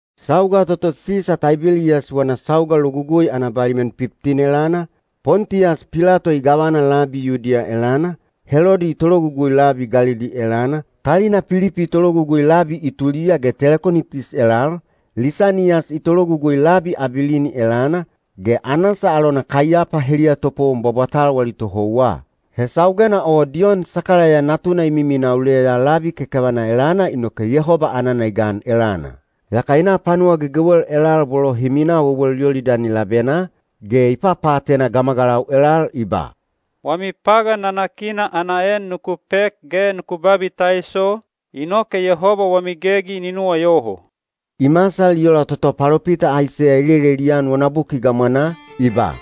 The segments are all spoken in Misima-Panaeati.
Sauga toto Sisa Taibeliyas wana sauga logugui ana baliman piptin elana, Pontiyas Pilato i gavana labi Yudiya elana, Helodi i tologugui labi Galili elana, talina Pilipi i tologugui labi Ituliya ge Telekonitis elal, Lisaniyas i tologugui labi Abilini elana, ge Anasa alona Kaiyapa heliya topowon bwabwatal wali tohouwa. He saugena o Diyon Sakalaiya natuna i miminaa uleya labi kekevana elana inoke Yehoba anana i gan elana. Yaka i na panuwa gegewel elal bolo hi minaa wewel Yolidani labenaa, ge i papaatena gamagalau elal i ba, “Wami pagan nanakina ana en nuku pek ge nuku babitaiso, inoke Yehoba wami gegi ni nuwayoho.” I masal i ola toto palopita Aiseya i lelelian wana buki gamwanaa, i ba: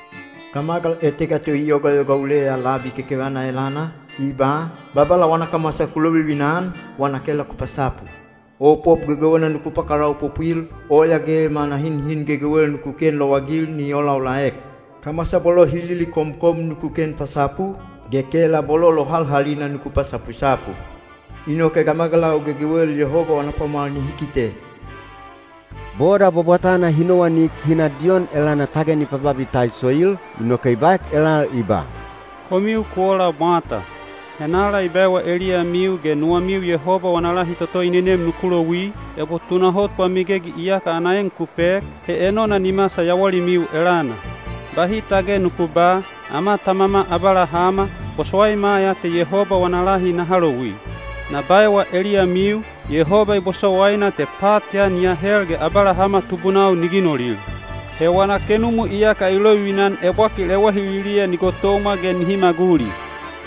Gamagal etega to i yogayoga uleya labi kekevana elana, i ba, “Babala wana kamwasa ku lovivina-an, wana kela ku pasapu. Opop gegewena nuku pakalaopopwil, oya ge manahinhin gegewel nuku ken lowagil ni olaolaek. Kamwasa bolo hi lilikomkom nuku ken pasapu, ge kela bolo lohalhalina nuku pasapusapu. Inoke gamagalau gegewel Yehoba wana pwamwal nihi kite.” Boda bwabwatana hi nowanik hi na Diyon elana tage ni pababitaisoil, inoke i baek elal i ba, “Komiu ku ola mwata! Henala i baewa eliyamiu ge nuwamiu Yehoba wana lahi toto i nenem nuku louwi? Ebo tunahot wami gegi iyaka ana en ku pek, he enona ni masal yawalimiu elana. Bahi tage nuku ba, ‘Ama tamama Abalahama, bosowaima ya te Yehoba wana lahi naha louwi.’ Na baewa eliyamiu, Yehoba i bosowaina te pat ya ni ahel ge Abalahama tubunau ni ginolil. He wana kenumu iyaka i lovivina-an ebwakil ewahililiya ni gotomwa ge nihi maguli.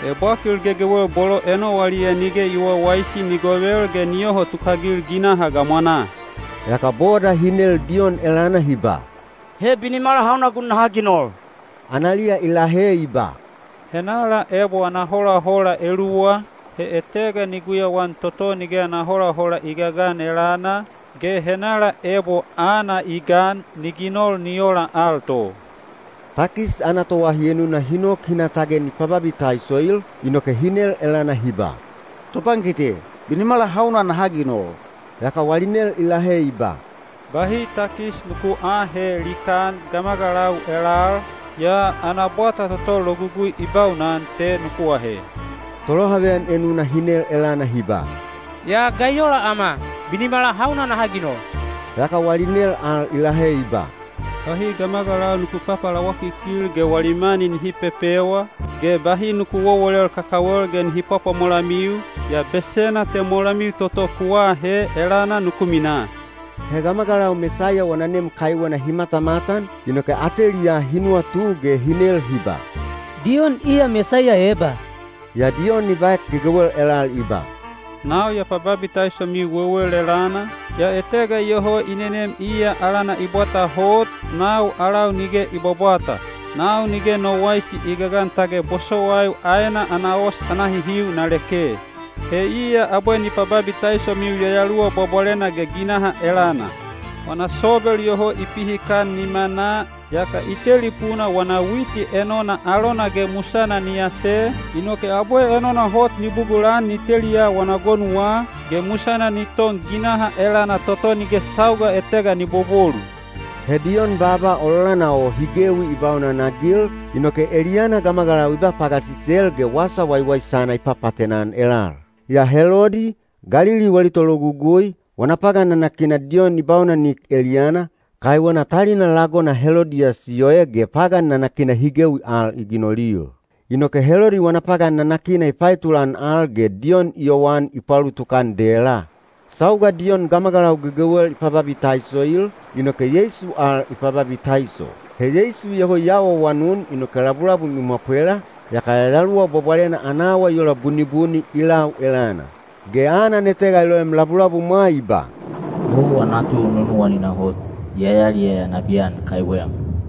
Ebwakil gegewel bolo enowaliya nige i wawaisi ni govel ge ni yoho tukagil ginaha gamwanaa.” Yaka boda hi nel Diyon elana hi ba, “He binimala hauna gun naha ginol?” Analiya i lahe i ba, “Henala ebo ana holahola eluwa, he etega ni guyauan toto nige ana holahola i gagan elana, ge henala ebo aana i gan, ni ginol ni ola al to.” Takis ana toahi enuna hi nok hi na tage ni pababitaisoil, inoke hi nel elana hi ba, “Topankite, binimala hauna naha ginol?” Yaka wali nel i lahe i ba, “Bahi takis nuku aahe likaan gamagalau elal, yaa ana bwata toto logugui i baunan te nuku ahe.” Tolohaveyan enuna hi nel elana hi ba, “Yaa ga i ola ama? Binimala hauna naha ginol?” Yaka wali nel al i lahe i ba, “Bahi gamagalau nuku papalawakikil ge wali mani nihi pepewa, ge bahi nuku wowolel kakawel ge nihi pwapwamolamiu, yaa besena te molamiu toto ku aahe elana nuku minaa.” He gamagalau Mesaiya wana nem kaiwena hi matamatan, inoke ateliyaa hi nuwatu ge hi nel hi ba, “Diyon iya Mesaiya eba?” Yaa Diyon i baek gegewel elal i ba, “Nau ya pababitaisomiu wewel elana, yaa etega iyoho i nenem iya alana i bwata hot, nau alau nige i bwabwata. Nau nige no waisi i gagan tage bosowaiu aena ana os ana hihiu na leke. He iya abwe ni pababitaisomiu Yayaluwa Bwabwalena ge ginaha elana. Wana sobel iyoho i pihikan nimanaa, yaka i tetelipuna wana witi enona alona ge musana ni ase, inoke abwe enona hot ni bugulan ni teliya wana gonuwa, ge musana ni ton ginaha elana toto nige sauga etega ni bobolu.” He Diyon baaba ololana o hi gewi i baunanagil, inoke eliyana gamagalau i ba pagasisel ge wasa waiwaisana i papaatena-an elal. Yaa Helodi, Galili wali tologugui, wana pagan nanakina Diyon i baunanek eliyana, kaiwena talina lagona Helodiyas i oe ge pagan nanakina hi gewi al i ginolil. Inoke Helodi wana pagan nanakina i paetulan al ge Diyon i yowan i paulutuk-an dela. Sauga Diyon gamagalau gegewel i pababitaisoil, inoke Yeisu al i pababitaiso. He Yeisu iyoho i awaawanun inoke labulabum i mwapwela, yaka Yayaluwa Bwabwalena ana awa i ola bunibuni i lau elana. Ge anan etega i loem labulabumwa i ba, “Owa natu nunuwanina hot, ya yaliyaya nabiyan kaiwem.”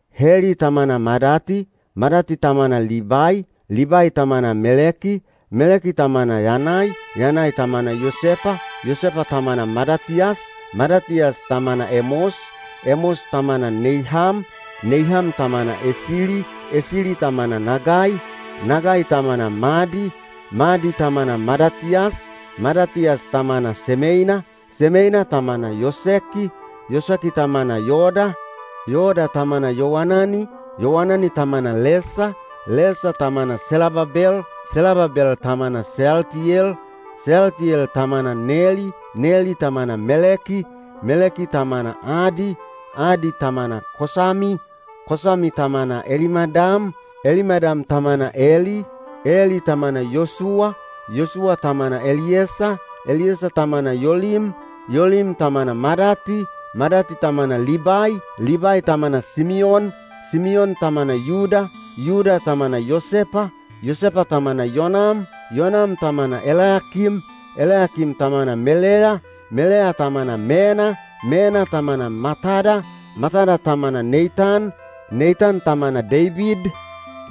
Heli tamana Madati, Madati tamana Libai, Libai tamana Meleki, Meleki tamana Yanai, Yanai tamana Yosepa, Yosepa tamana Madatiyas, Madatiyas tamana Emos, Emos tamana Neiham, Neiham tamana Esili, Esili tamana Nagai, Nagai tamana Madi, Madi tamana Madatiyas, Madatiyas tamana Semeina, Semeina tamana Yoseki, Yoseki tamana Yoda, Yoda tamana Yowanani, Yowanani tamana Lesa, Lesa tamana Selababel, Selababel tamana Seyaltiyel, Seyaltiyel tamana Neli, Neli tamana Meleki, Meleki tamana Adi, Adi tamana Kosami, Kosami tamana Elimadam, Elimadam tamana Eli, Eli tamana Yosuwa, Yosuwa tamana Eliyesa, Eliyesa tamana Yolim, Yolim tamana Madati, Madati tamana Libai, Libai tamana Simiyon, Simiyon tamana Yuda, Yuda tamana Yosepa, Yosepa tamana Yonam, Yonam tamana Elayakim, Elayakim tamana Meleya, Meleya tamana Mena, Mena tamana Matada, Matada tamana Neitan, Neitan tamana Deibid,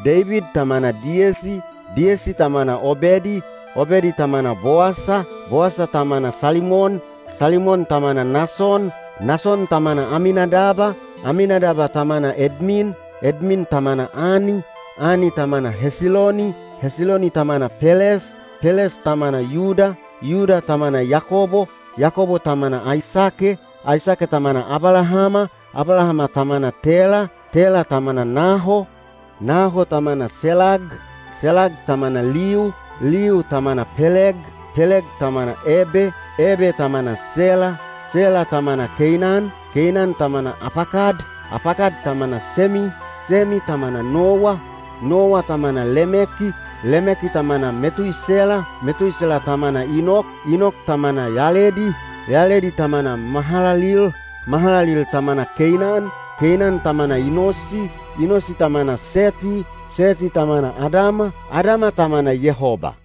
Deibid tamana Diyesi, Diyesi tamana Obedi, Obedi tamana Bowasa, Bowasa tamana Salimon, Salimon tamana Nason, Nason tamana Aminadab, Aminadab tamana Edmin, Edmin tamana Ani, Ani tamana Hesiloni, Hesiloni tamana Peles, Peles tamana Yuda, Yuda tamana Yakobo, Yakobo tamana Aisake, Aisake tamana Abalahama, Abalahama tamana Tela, Tela tamana Naho, Naho tamana Selag, Selag tamana Liu, Liu tamana Peleg, Peleg tamana Ebe, Ebe tamana Sela, Sela tamana Keinan, Keinan tamana Apakad, Apakad tamana Semi, Semi tamana Nowa, Nowa tamana Lemeki, Lemeki tamana Metuisela, Metuisela tamana Inok, Inok tamana Yaledi, Yaledi tamana Mahalalil, Mahalalil tamana Keinan, Keinan tamana Inosi, Inosi tamana Seti, Seti tamana Adama, Adama tamana Yehoba.